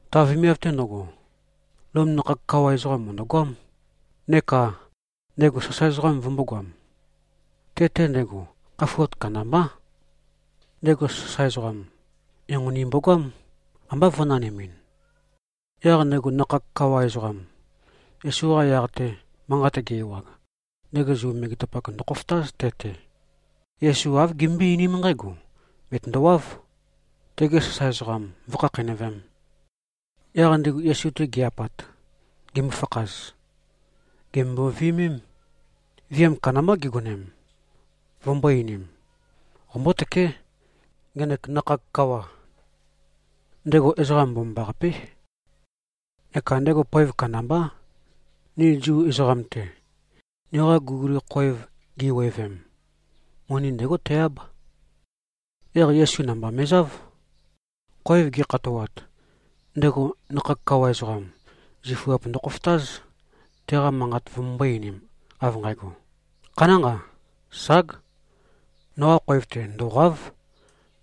Ta vemiav-te ndøgo, Lom nakhag kawa ezoqam mø̀ndøgoám, neka ndego sasae ezoqam vømbōgoam. Te-te ndego khafuat kandambá. Ndego sasae ezoqam, enqoni mbogoám, ambá vø̄nanimin. Yaq ndego nakhag kawa ezoqam, Yesu-qa yaq-te manqat ge-ewag, ndego Zu megetapak ndøkhofotáz, te-te. Yesu āv gimbøé-einím nqǽgo: Bètøndowáv, tege sasae ezoqam vǿkhakheinøvēm. Yaq ndigu Yesu-te gi-apat, gimøfakhaz, gèmømbo-viømém. Viam kandambá gigonem, vømbō-einim, “Qombótøké, ngenek nakhag kawa. Ndego ezoqa mbomambaqapé, neka ndego poev kandambá, ni Zu ezoqam-te. Niqa guliguli khoev giwevem, moni ndégo te-áb.” Yaq Yesu namba me꞉záv. Khoev gi꞉khatoat, ndego nakhag kawa ezoqam, zifuap ndokhofotáz, teqa manqat vømømbō-einim, av nqægo, “Khanánqa. Ság. Noqa khoev-te ndòqa᷄v.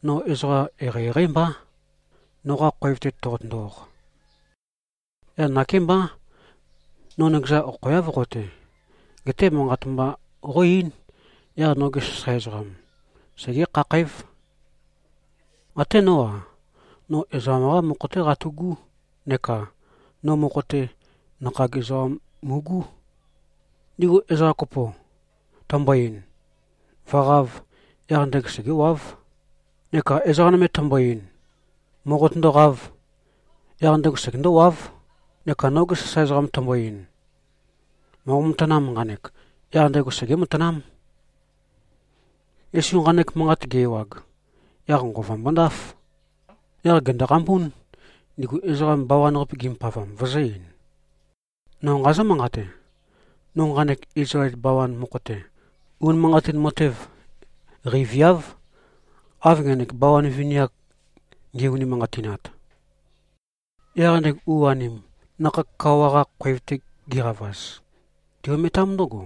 No ezoqa eqeieqeí mbá, noqa khoev-te toqotøndo-oq. Yaq nakémbá, no nøkezan okhoeáv qo-te. Geté manqat mba qó-eín. Yaq noge sasae ezoqam segé-khakhǽv. Até nó-a, no ezoqam-qá mokho-té qatu꞉gú. Neka no mokho-te, nakhag ezoqam mu꞉gú. Ndigu ezoqa kopo tæmbo-ein, ‘Vø̀qāv’, yaq ndego segéwáv. Neka ezoqa nøme tæmbo-ein, ‘Mòqotøndoqāv’, yaq ndego segendówáv. Neka noge sasae ezoqam tæmbo-ein, ‘Mòqo-matanām, nqanek’, yaq ndego segé-matanám.” Yesu nqanek manqat ge-ewag, yaq nqova mbondáf. Yaq gèndoqambún, ndigu ezoqa bawan-qape gimbopavam, vøzø̄-ein, “No nqazǿ-manqate. No nqanek Izlael bawan mokho-te, unimanqatin matev qeiviáv, av ngenek bawan vini-ak nge꞉-unimanqatinat.” Yaq ndigu u-anim, nakhag kawa-qa khoev-te giqavaz, ti-ometám ndǿgo,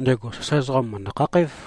ndego sasae ezoqam, mø̀ndø-khakhǽv.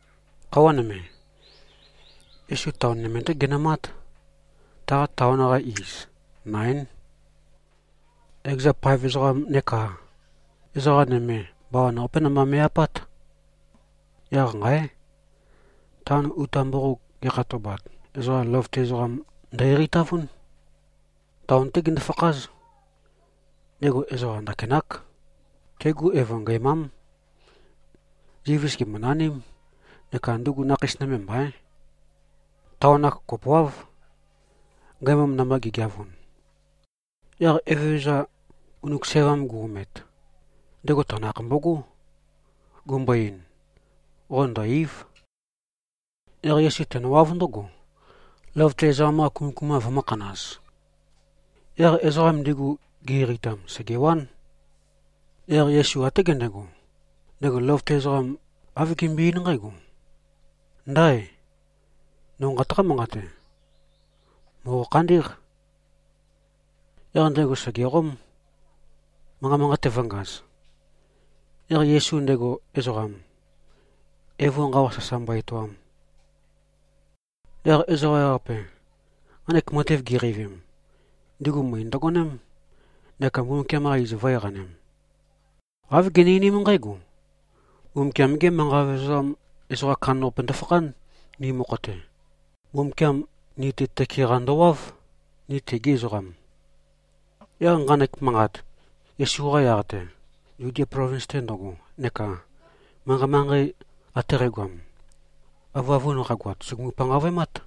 Khøuwa nøme, Yesu taon nøme-té genømát. Ta taon-qa iz, Naín. Ekeza paev ezoqam neka ezoqa nøme bawan-qapé namba me꞉-apát. Yaq nqáe! Taon uta mboqog ge꞉khatobat, ezoqa løvøte ezoqam ndø-eqeitavún. Taon-té gindu-fakház. Ndego ezoqa ndakinák. Tegu evo ngæmám. Zivis gèmbonaním, neka ndugu nakheis nøme mbaín. Taon-ak kopoáv, ngæmam namba gi꞉geavun. Yaq Evezøza ngunuk sævam gu-omet, ndego tanakh mbogó, gumbo-ein, “Qo ndø̀-ei᷄v.” Yaq Yesu tenøwáv ndǿgo, løvøte ezoqam-qa kumøkuma vømø̄khanaz. Yaq ezoqam ndigu, gi-eqeitam, sègewán. Yaq Yesu até gendego, ndego løvøte ezoqam, āv gembøe-eín nqǽgo, “Ndáe! No nqataqá-manqate. Mòqo-khandí꞉q.” Yaq ndego sègeqóm, manqa manqate vø̄ngaz, yaq Yesu ndego ezoqam, evo nqawa sasa mbo-etoam. Yaq ezoqa ewaqape, nqanek matev giqeivim, ndigu møe ndøgoném, neka Mbumbukiam-qa iz vø̄-eqanem. Āv gini-einím nqǽgo, “Mbumbukiam-gé manqa vevezam ezoqam kandambaqape ndøfakhán, ni mokho-te. Mbumbukiam ni-te tøke-qa ndowáv, ni tegi ezoqam.” Yaq nqanek manqat, Yesu-qa yaq-te, Zudia plovins-te ndøgo neka manqei-manqei ate qægoam, avøavun qagoat, sùgumu-panqavøemát.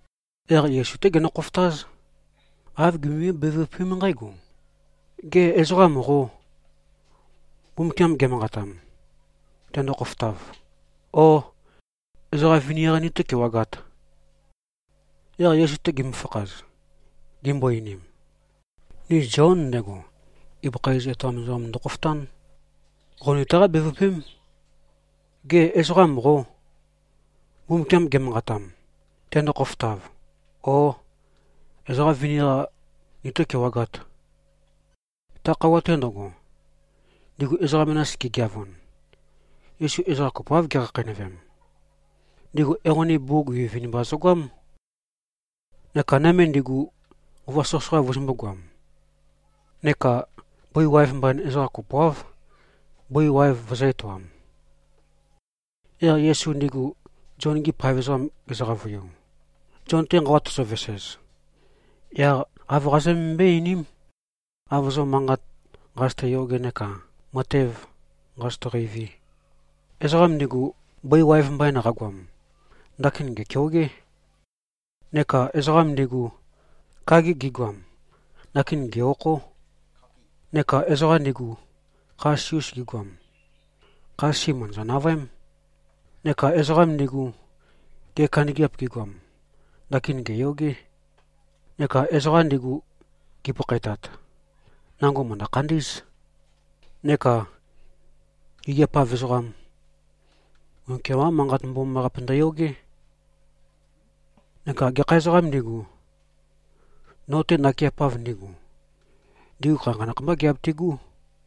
Yaq Yesu-té genø-khofotáz. Āv gimømbøé-bevøpém nqǽgo, “Gê, ezoqam qô, Mbumbukiam ge꞉manqatam, tendo-khofotav? Ó, ezoqa vini-qa nitó-kewagāt?” Yaq Yesu-te gimøfakhaz, gimbo-einim, “Ni Zion, ndego ibøkha iz etoam ezoqam, ndokhofotán. Qo nitaqá-bevøpém: Gê, ezoqam qô, Mbumbukiam ge꞉manqatam, tendo-khofotav? Ó, ezoqa vini-qa nitó-kewagāt?” Ta khøuwa-te ndøgo, ndigu ezoqa menas gigeavun, Yesu ezoqa kopoáv gekhakheinøvem. Ndigu enqoni bugug vinivinimba zøgoám neka nøme ndigu, nqova soqøsoqa vøzømbū-goam. Neka bøi waev mbain ezoqa kopoáv, bøi waev vøzø̄-etoam. Yaq Yesu ndigu Zion-gi paev ezoqam gezø-qavøiu, “Zion-te nqawa tozovesez, yaq āv qazømømbøé-einím, av zo manqat nqazøte-yoge neka matev nqazøte-qeivi. Ezoqam ndigu, bøi waev mbain qagoam, ndakin gèkeogé. Neka ezoqam ndigu, kagi gigoam, ndakin gè-okhó. Neka ezoqa ndigu, kha sisi-us gigoam, kha sisi mø̀ndøzø-navøém. Neka ezoqa ndigu, gea kandøgeap gigoam, ndakin gèyogé. Neka ezoqa ndigu, gipakhaetat, nango mø̀ndø-khandí꞉z. Neka gigiap-av ezoqam, Mbumbukiam-qá Manqat Mbomambaqape ndøyogé. Neka gekha ezoqām ndigu, no-te nakeapav ndigu, ndigu khanakhanakh mbá giabitigú.”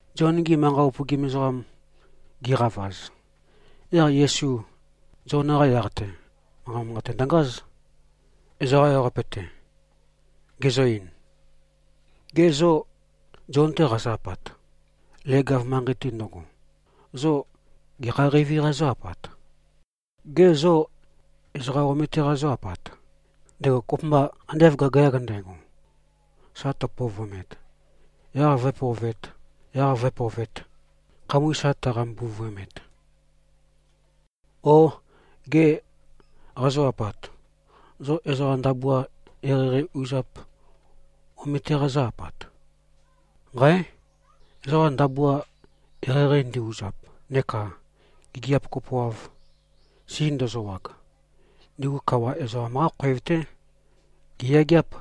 Zion-gi manqa upøgim ezoqam gi꞉qavaz, yaq Yesu Zion-qa yaq-te manqa manqate ndøngáz, ezoqa ewaqape-te, gezø-ein, “Gê, zo Zion-te qazo-apat, leg-av manqei-te ndøgo, zo gekha qeivi-qa zó-apat? Gê, zo ezoqa omete-qa zó-apat, ndego kopømba ande av gagayag ndægo, sa tøpovøemet, yaq vǿepovēt, yaq vǿepovēt, khamøe sa tøqambuvøemet? O gê, qazo-apat, zo ezoqa ndabua eqeieqei uzap omete-qa zó-apat? Nqáe! Ezoqa ndabua eqeieqei ndi-uzap neka gigiap kopoav si ndøzøwag, ndigu kawa ezoqam-qá khoev-té giyageáp.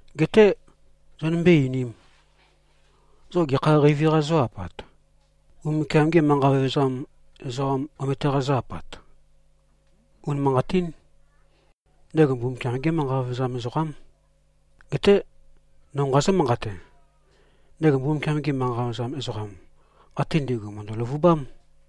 Geté zonømbé-einīm. Zo gekha qeivi-qa zó-apat? Mbumbukiam-gê manqa vevezam ezoqam omete-qa zó-apat? Unimanqatín. Ndego Mbumbukiam-gé manqa vevezam ezoqám. Geté no nqazǿ-manqate. Ndego Mbumbukiam-gi manqa vevezam ezoqam ate ndi꞉gu, mø̀ndø-løvubám.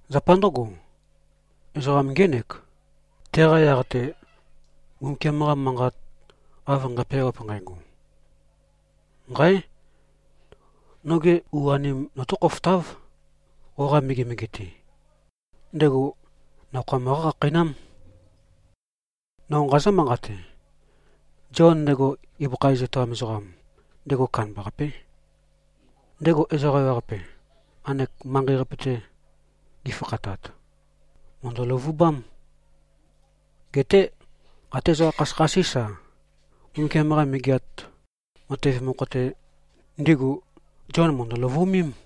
Zapa ndǿgo, ezoqam ngének, teqa yaq-te Mbumbukiam-qa Manqat av nqæpeawap nqægo, ‘Nqáe! Noge u-anem notó-khofotáv, qoqa megemege-te. Ndego nakhoa møqá-khakheinám.’ No nqazǿ-manqate. Zion, ndego ibøkha iz etoam ezoqam, ndego kandambaqapé. Ndego ezoqa ewaqape, nqanek manqei-qape-te gifakhatat, mø̀ndø-løvubám. Geté até ezoqa khasøkhasís-a, Mbumbukiam-qa Megeat Matev mokho-te, ndigu Zion mø̀ndø-løvu꞉mém.”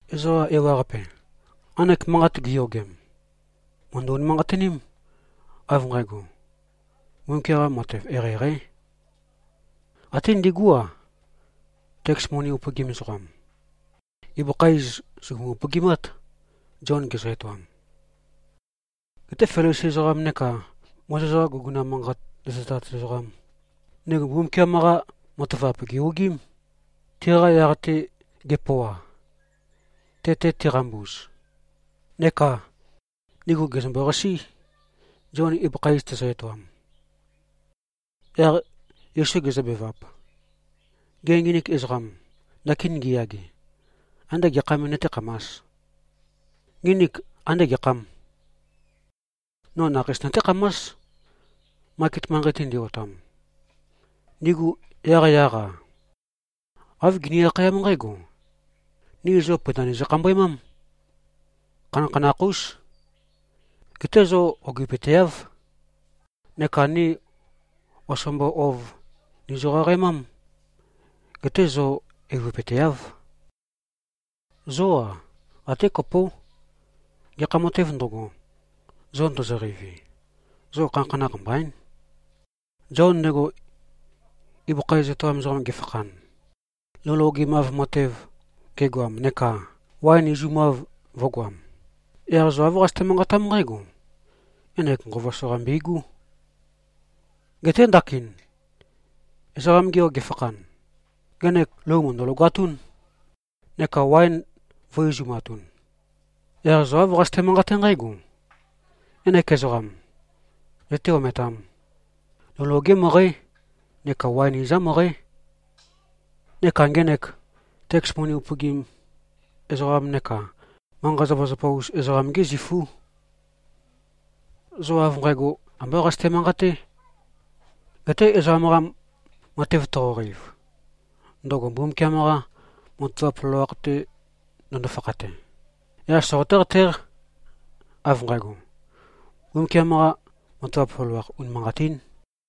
Ezoqa ewaqape, nqanek manqat giyogem, mø̀ndø-unimanqatiním, av nqægo, Mbumbukiam-qa matev eqeieqeí. Até ndigú-a, teks moni upøgim ezoqam. Ibøkha iz sùgumu-upøgimát, Zion gezø-etoam. Geté Felisi ezoqam neka Mozes-qa guguna manqat zøtezat ezoqam, ndigu Mbumbukiam-qa matavap gè-ogiím, tiqa yaq-te ge꞉pøoa, te-te tiqambuz. Neka ndigu gèzømbo-qasí, Zion ibøkha iz tezø-etoam. Yaq Yesu gezøbevap, “Gê, nginik ezoqam, ndakin ngiyage, andé gekha me nøtékhamās? Nginik ande gekhâm? No nakheis nøtékhamás, maket manqei-te ndi-otam. Ndigu yaqyaq-a, āv gini-akhayám nqǽgo, ‘Ni zo pøinda nizø-khambøemám. Khanakhanakh-ús. Geté zo ogipøteáv. Neka ni osombo ouv nizø-qaqaemám. Geté zo eivøpøteáv.’ Zó-a, até kopó. Gekha matēv ndøgo, zo ndozoqeivi, zo khanakhanakh mbaín. Zion ndego ibøkha iz etoam ezoqam gefakhan, lou logemav matev gegoam, neka waen izumav vø̄goam, yaq zo āv qazøte-manqatám nqǽgo, ‘Ngenek nqova soqa mbøigú.’ Geté ndakin Ezoqam-ge Yo gefakhan, ngenek lou mø̀ndø-logatún, neka waen vø̄-izumatun. Yaq zo āv qazøte-manqaté nqǽgo, ‘Ngenek ezoqam zøté-ometām! Lou loge møqǽ, neka waen izam møqǽ. Neka ngenek teks moni upøgim ezoqam neka manqa-zapazapa-us ezoqam-gí zifú.’ Zo av nqægo ambá qazøte-manqaté. Geté ezoqam-qa matev toqoqeiv, ndøgo Mbumbukiam-qa matavap loloakh-te ndøndo-fakhate, yaq soqoté-qatéq, av nqægo, Mbumbukiam-qa matavap loloakh, unimanqatín.”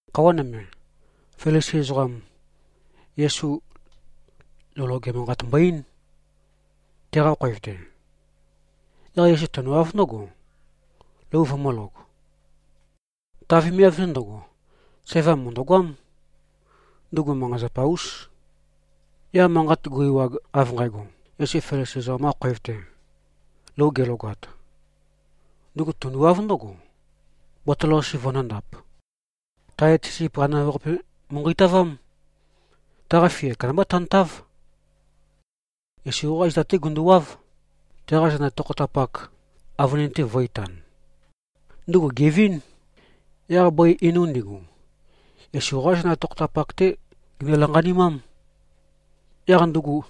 Khøuwa nøme, Felisi ezoqam, Yesu lou loge manqat mbo-eín, teqa khoev-te. Yaq Yesu tenøwáv ndǿgo, lou vømø̄log. Ta vemiav-te ndøgo, sævam mø̀ndøgoám. Ndugu manqa-zapa-ús. Yaq manqat gu-ewag av nqægo, Yesu Felisi ezoqam-qa khoev-te lou gelogat, ndugu tunduwáv ndǿgo, botol-qase vøndōndap. Tae et sisip qanimav-qape mu꞉nqeitavám. Taqa fia kandambá tantáv. Yesu-qá zita-té gunduwáv, teqa zenda tokhotapak avønin-te vø̄-itan. Ndugu gèvín. Yaq bøi einu ndigu, Yesu-qá zenda tokhotapak-té ginø-lanqanimám. Yaq ndugu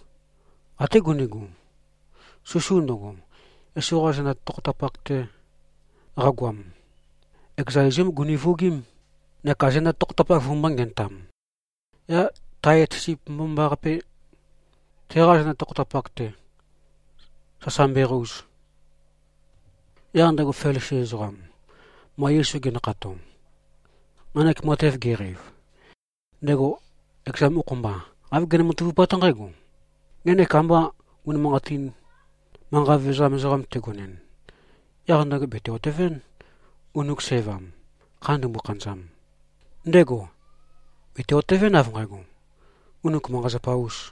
até gundigu, susu ndøgo, Yesu-qa zenda tokhotapak-te qagoam, ekeza izúm guni-vuogím, neka zenda tokhotapak vømbō-ngenøtam, yaq tae et sisip mbomambaqape, teqa zenda tokhotapak-te sasa mbøeqouz. Yaq ndego Felisi ezoqam, ma Yesu gendekhato, nqanek matev geqeiv, ndego ekeza mokho-mba, āv gene-matavupát nqǽgo, “Ngenek amba unimanqatin manqa vevezam ezoqam tegonɨn, yaq ndego bète-otevɨ́n, ngunuk sævam, kha ndumbo-khanøzam. Ndego bète-otevɨ́n, av nqægo, ndugu manqa-zapa-ús.”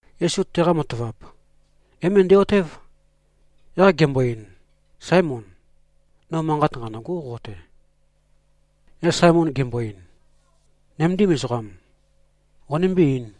Yesu teqa matavap é-møndæ-otév, yaq gembo-ein, “Sáemon. No manqat nqanø̂gó, qo-te.” Yaq Saemon gembo-ein, “Nøméndim ezoqam, qonømbé-eīn.”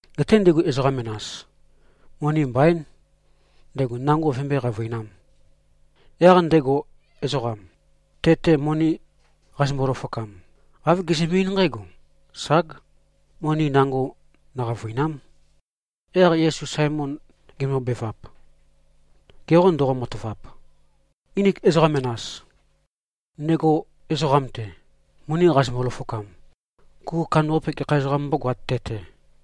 Geté ndigu ezoqa menas, moni mbaín, ndego nango vømbøé-qavøinām. Yaq ndego ezoqam, te-te moni qazømbo-løfokam, āv gezømbe-eín nqǽgo, ‘Ság, moni nango nøqavø̀ina᷄m.’” Yaq Yesu Saemon gembobevap, “Ge qô ndoqo-matavap? Nginik ezoqa menas, ndego ezoqam-te moni qazømbo-løfokam, kuku kandambaqape gekha ezoqām mbógoāt, te-te?”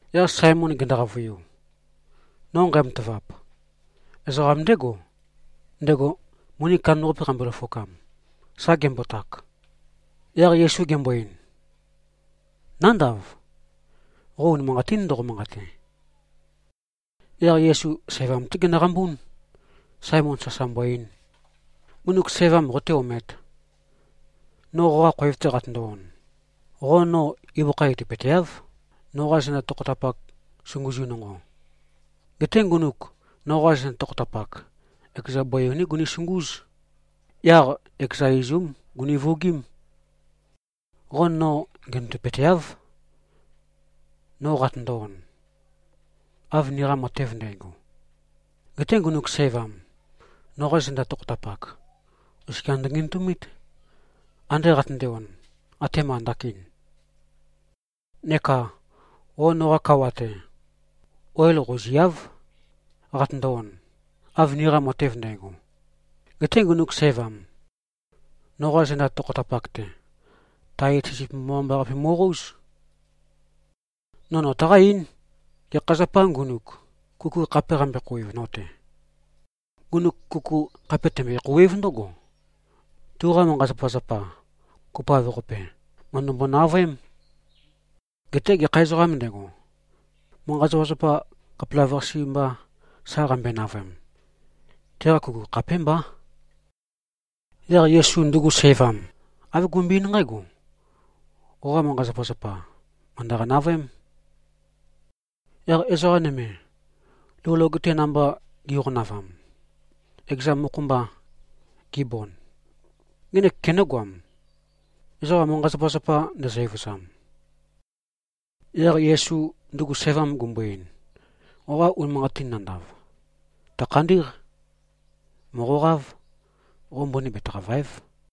Yaq Saemon gendo-qavøiu, “No nqæmatavap: Ezoqam ndégo, ndego moni kandambaqape qambøe-løfokam, sa gembotak.” Yaq Yesu gembo-ein, “Nándav. Qo unimanqatín ndoqo-manqate.” Yaq Yesu sævam-té genøqambún, Saemon sasa mbo-ein, “Ngunuk sævam qoté-omēt. No qoqa khoev-te qatøndo-on, qo no ibøkha etopøteáv, noqa zenda tokhotapak sunguzu nonqo. Geté ngunuk noqa zenda tokhotapak, ekeza bøi einú gunisungúz. Yaq ekeza izúm guni-vuogím. Qo no ngenøndøpøteáv, no qatøndo-on, av niqa matev ndægo. Geté ngunuk sævam, noqa zenda tokhotapak, oskia ndøngenøtumít, ande qatønde-on, atema ndakin. Neka qo noqa kawa-te, oil qouziáv, qatøndo-on, av niqa matev ndægo. Geté ngunuk sævam, noqa zenda tokhotapak-te, tae et sisip mbomambaqape mo꞉qóuz. No nøtaqá-eín, gekha zapā ngunuk kuku khape qambe-khouwev no-te. Ngunuk kuku khape tømbøe-khouwév ndǿgo, tuqa manqa-zapazapa kopoav-qape, mø̀ndømbo-navøém. Geté gekha ezoqām ndego, manqa-zapazapa khapelavøqase mba sa qambøe-navøem, teqa kuku khapémbá.” Yaq Yesu ndugu sævam āv gumbøe-eín nqǽgo, “Qoqa manqa-zapazapa, mø̀ndøqa-navøém.” Yaq ezoqa nøme, lou loge-te namba gi꞉qonavam, ekeza mokho-mba gibond, “Ngenek kenǿgoam, ezoqa manqa-zapazapa ndezø-evøzam?” Yaq Yesu ndugu sævam gumbo-ein, “Qoqa unimanqatin nandav, tø̀khandí꞉q. Mòqoqáv. Qo mbøni betaqàva᷄ev.”